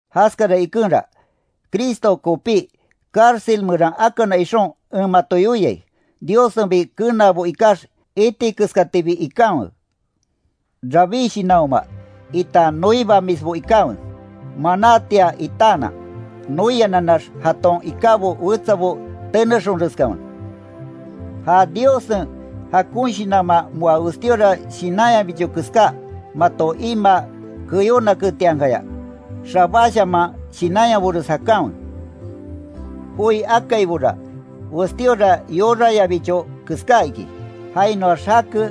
Jaskara ikenra, Cristo kopí cárcel meran akana ixon, en mato yoiai, Diossenbi kenaabo ikax iti keskatibi ikanwe. Rabí shinanhoma, itan noibamisbo ikanwe, manátia itaanan, noiananax jaton ikábo wetsabo tenexonreskanwe. Ja Diossen jakon Shinanman moa westíora shinanyabicho keská, mato imaa keyónaketiankaya, xabáshaman shinanyabores jakanwe. Joi akaibora, westíora yorayabicho keská iki. Jainoax jake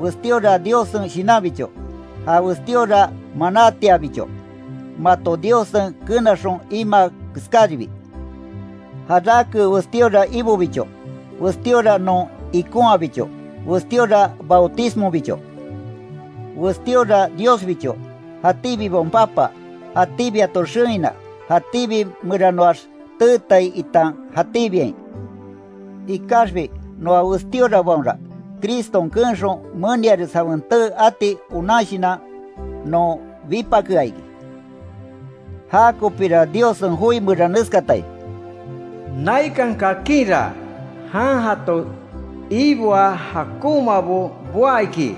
westíora Diossen Shinanbicho. Ja westíora manátiabicho, mato Diossen kenaxon imaa keskáribi. Jarake westíora Ibobicho; westíora non ikonhabicho; westíora bautismobicho, westíora Diosbicho; jatíbibaon Papa; jatíbi jato xewina; jatíbi meranoax teetai itan jatíbiain. Ikaxbi noa westíorabaonra, Criston keenxon, meniares jawen tee ati onan shinan non bipakea iki. Jakopíra Diossen joi meran neskatai: “Naikan kakinra, jan jato iboa jakonmabo boá iki,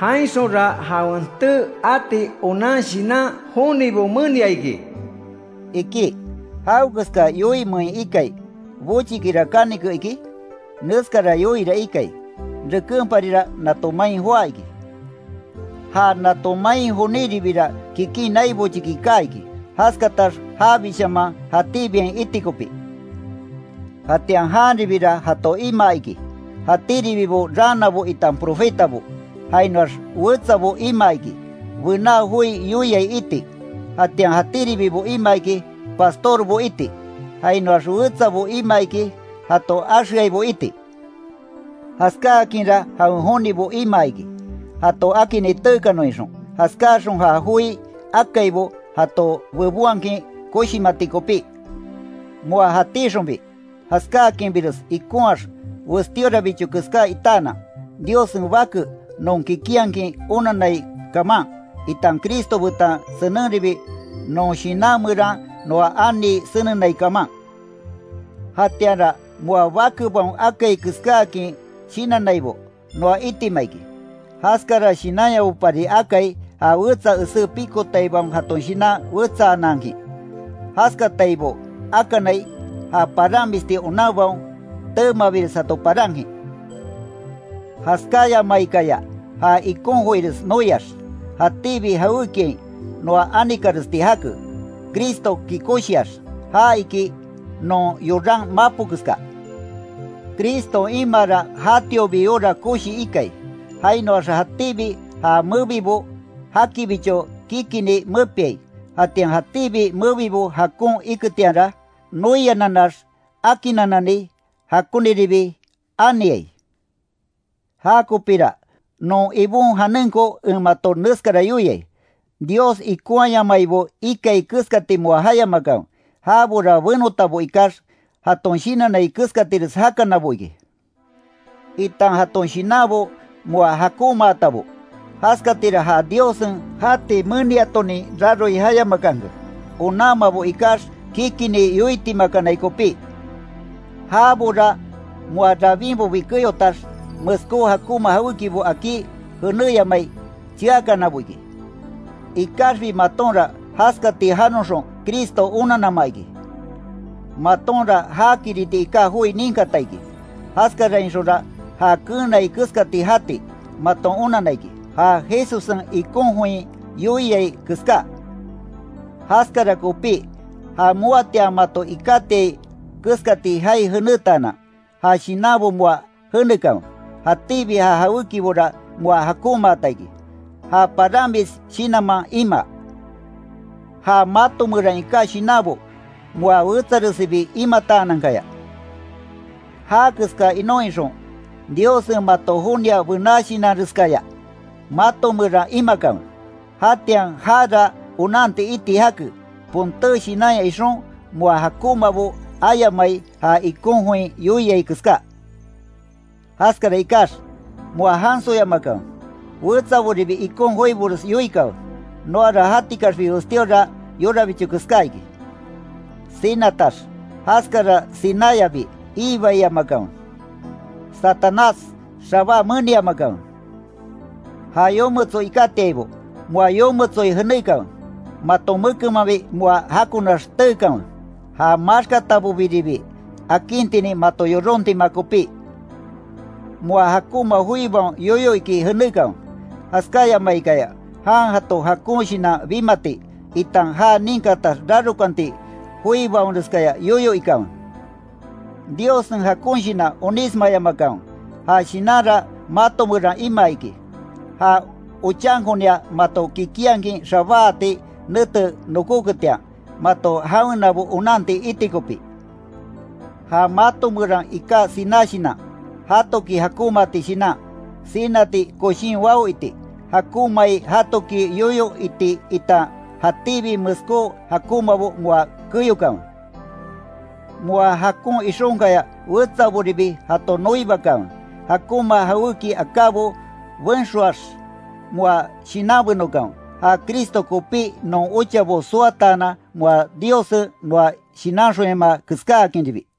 jainxonra jawen tee ati onan shinan jonibo menia iki”, iki. ¿Jawekeska yoimein ikai, bochikira kanike, iki? Neskara yoira ikai: Rekenparira nato main joá iki. Ja nato main joníribira, kikin nai bochiki kaa iki, jaskatax jabishaman jatíbiain iti kopí. Jatian janribira, jato imaa iki, jatíribibo raanabo itan profetabo; jainoax wetsabo imaa iki, bená joi yoiai iti; jatian jatíribibo imaa iki, pastorbo iti; jainoax wetsabo imaa iki, jato axeaibo iti. Jaskáakinra jawen jonibo imaa iki, jato akinni teekanon ixon, jaskáaxon ja joi akaibo jato bebonhakin koshimati kopí. Moa jatíxonbi jaskáakinbires ikonhaax westíorabicho keská itaanan, Diossen Bake non kikinhakin onannai kaman, itan Cristo betan senenribi non shinan meran noa anii senenai kaman. Jatianra moa bakebaon akai keskáakin shinannaibo, noa itima iki, jaskara shinanyabopari akai, ja wetsa esé pikotaibaon jaton shinan wetsaanankin, jaskataibo akanai, ja paramisti onanbaon teemabires jato parankin. Jaskáyamaikaya, ja ikon joires noiax, jatíbi jawékiain noa anikaresti jake Cristoki koshiax, ja iki, non yoran mapo keska. Criston imaara jatiobi yora koshi ikai, jainoaxa jatíbi ja mebibo jakibicho kikinni mepiai, jatian jatíbi mebibo jakon iketianra, noiananax akinnanani jakoniribi aniai. Jakopira, non Ibon janenko en mato neskara yoiai: Dios ikonhayamaibo ikai keskati moa jayamakanwe. Jabora benotabo ikax, jaton shinannai keskatires jakanabo iki, itan jaton shinanbo moa jakonmaatabo. Jaskatira ja Diossen jati meniatonin raroi jayamakanke, onanmabo ikax, kikinni yoitimakanai kopí. Jabora moa rabinbobi keyotax, meskó jakonma jawékibo akí jenéyamai cheakanabo iki. Ikaxbi matonra, jaskati janoxon Cristo onannama iki. Matonra jakiriti iká joi ninkata iki, jaskarainxonra, já keenai keskati jati, maton onanna iki, ja Jesussen ikon join yoiai keská. Jaskara kopí, ja moatian mato ikátiai keskati jaai jenétaanan, ja shinanbo moa jenekanwe. Jatíbi ja jawékibora moa jakonmaata iki, ja paramis shinanman imaa. Ja mato meran iká shinanbo, moa wetsaresibi imataanankaya, já keska inon ixon, Diossen mato jonia bená shinanreskaya mato meran imakanwe. Jatian jara onanti iti jake, ponté shinanya ixon, moa jakonmabo ayamai, ja ikon join yoiai keská. Jaskara ikax, moa jansoyamakanwe, wetsaboribi ikon joibores yoikanwe, noara jatikaxbi westíora yorabicho keská iki. Sinatax, jaskara sináyabi iibaiyamakanwe. Satanás xabá meniamakanwe. Ja yometso ikátiaibo, moa yometsoi jenékanwe. Maton mekenmanbi moa jakonax teekanwe, ja maxkatabobiribi akintinin mato yorontima kopí. Moa jakonma joibaon yoyo iki jenékanwe, jaskayamaikaya jan jato jakon shinan bimati, itan ja ninkatax rarokanti joibaonreskaya yoyo ikanwe. Diossen jakon Shinan onísmayamakanwe. Ja Shinanra mato meran imaa iki, ja ochankonia mato kikinhakin xabáati nete nokóketian, mato jawenabo onanti iti kopí. Ja mato meraa iká siná shinan, jatoki jakonmaati shinan, sinati koshín wao iti, jakonmai jatoki yoyo iti itan jatíbi meskó jakonmabo moa keyokanwe. Moa jakon ixonkaya wetsaboribi jato noibakanwe. Jakonma jawéki akábo benxoax, moa shinanbenokanwe, ja Cristo kopí non ochabo soataanan moa Diossen noa shinanxonyamaa keskáakinribi.